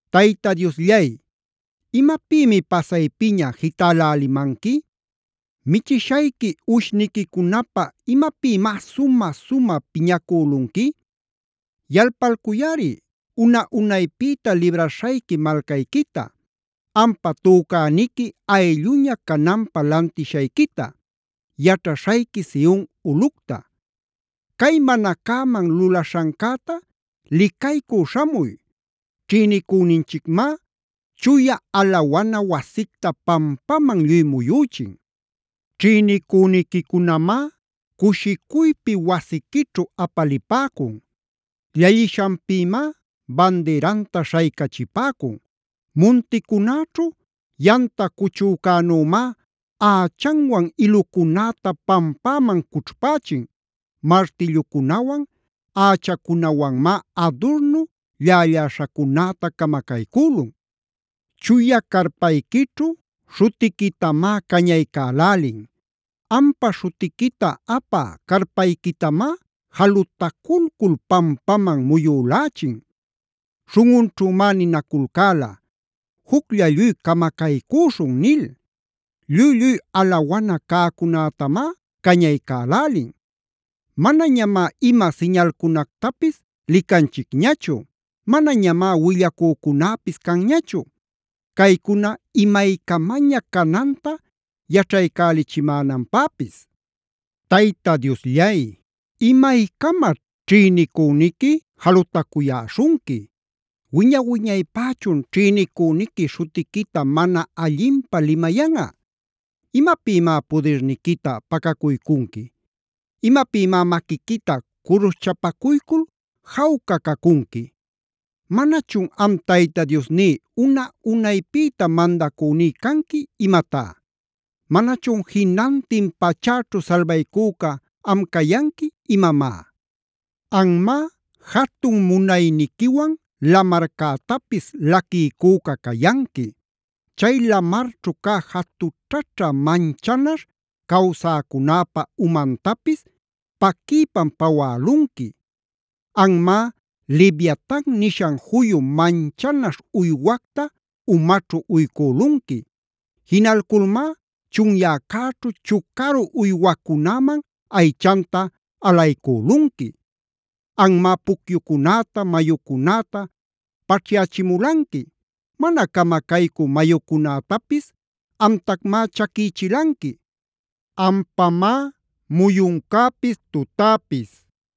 Tayta Diosllay, ¿imapïmi pasaypiña jitälälimanqui? ¿Michishayqui uwishniquicunapä imapïmá sumä-sumä piñacülunqui? Yalpalcuyꞌari una-unaypïta libraśhayqui malcayquita, ampa tücäniqui aylluña cananpä lantishayquita, yaćhaśhayqui Sion ulꞌucta. Cay mana cäman lulaśhancäta licaycü śhamuy. Ćhïnicüninchicmá chuya alawana wasicta pampaman lluy muyüchin. Ćhïnicüniquicunamá cushicuypi wasiquićhu apalipäcun. Llallishanpïmá bandiranta śhaycachipäcun. Munticunäćhu yamta cuchücänümá ächanwan ilucunäta pampäman cućhpächin. Martillucunawan ächacunawanmá adurnu llälläśhacunäta camacaycülun. Chuya carpayquićhu śhutiquitamá cañaycälälin. Ampa śhutiquita apä carpayquitamá jalutaculcul pampamam muyülächin. Śhunꞌunćhümá ninaculcäla: “Juclla lluy camacaycüśhun” nil. Lluy-lluy alawana cäcunätamá cañaycälälin. Manañamá ima siñalcunactapis licanchicñachu. Manañamá willacücunäpis canñachu, caycuna imaycamaña cananta yaćhaycälichimänanpäpis. Tayta Diosllay, ¿imaycamaćh ćhïnicüniqui jalutacuyäśhunqui? ¿Wiña-wiñaypächun ćhïnicüniqui śhutiquita mana allinpä limayanꞌa? ¿Imapïmá pudirniquita pacacuycunqui? ¿Imapïmá maquiquita curushchapacuycul jawca cacunqui? ¿Manachun am Tayta Diosní una-unaypïta mandacüní canqui imatá? ¿Manachun jinantin pachäćhu salbaycüca am cayanqui imamá? Anmá jatun munayniquiwan lamarcätapis laquiycüca cayanqui.a Chay lamarćhu cä jatućhaćha manchanaśh cawsäcunäpa umantapis paquiypam pawälunqui. Anmá Leviatan nishan juyu manchanaśh uywacta umaćhu uycülunqui.b Jinalculmá chunyäcäćhu chucaru uywacunäman aychanta alaycülunqui. Anmá pucyucunäta, mayucunäta paćhyachimulanqui. Mana camacaycü mayucunätapis amtacmá chaquïchilanqui. Ampamá muyuncäpis tutäpis.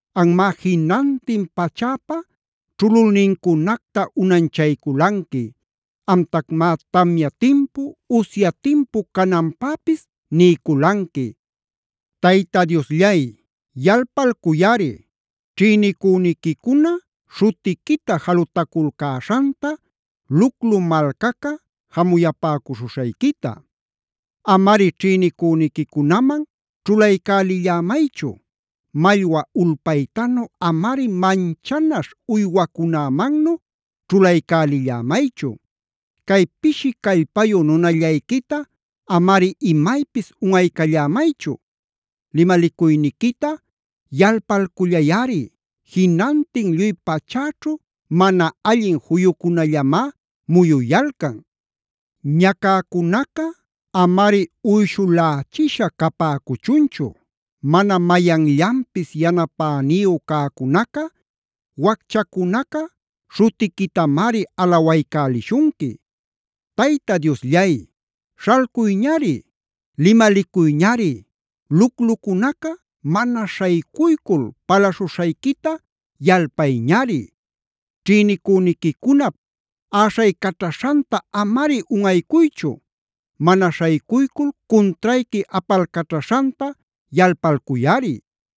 Anmá jinantin pachäpa ćhululnincunacta unanchayculanqui. Amtacmá tamya timpu, usya timpu cananpäpis niyculanqui. Tayta Diosllay, yalpalcuyꞌari ćhïnicüniquicuna śhutiquita jalutaculcäśhanta, luclu malcaca jamuyapäcuśhuśhayquita. Amari ćhïnicünïcunaman ćhulaycälillämaychu. Mallwa ulpaytanu amari manchanaśh uywacunämannu ćhulaycälillämaychu. Cay pishi callpayu nunallayquita amari imaypis unꞌaycallämaychu. Limalicuyniquita yalpalcullayꞌari, jinantin lluy pachäćhu mana allin juyucunallamá muyuyalcan. Ñacäcunaca amari uyshulächisha capäcuchunchu. Mana mayanllanpis yanapäniyu cäcunaca, wacchacunaca śhutiquitamari alawaycälishunqui. ¡Tayta Diosllay, śhalcuyñari! ¡Limalicuyñari! ¡Luclucunaca mana śhaycuycul palaśhuśhayquita yalpayñari! Ćhïnicüniquicunap äśhaycaćhaśhanta,d amari unꞌaycuychu. Mana śhaycuycul cuntrayqui apalcaćhaśhanta yalpalcuyꞌari.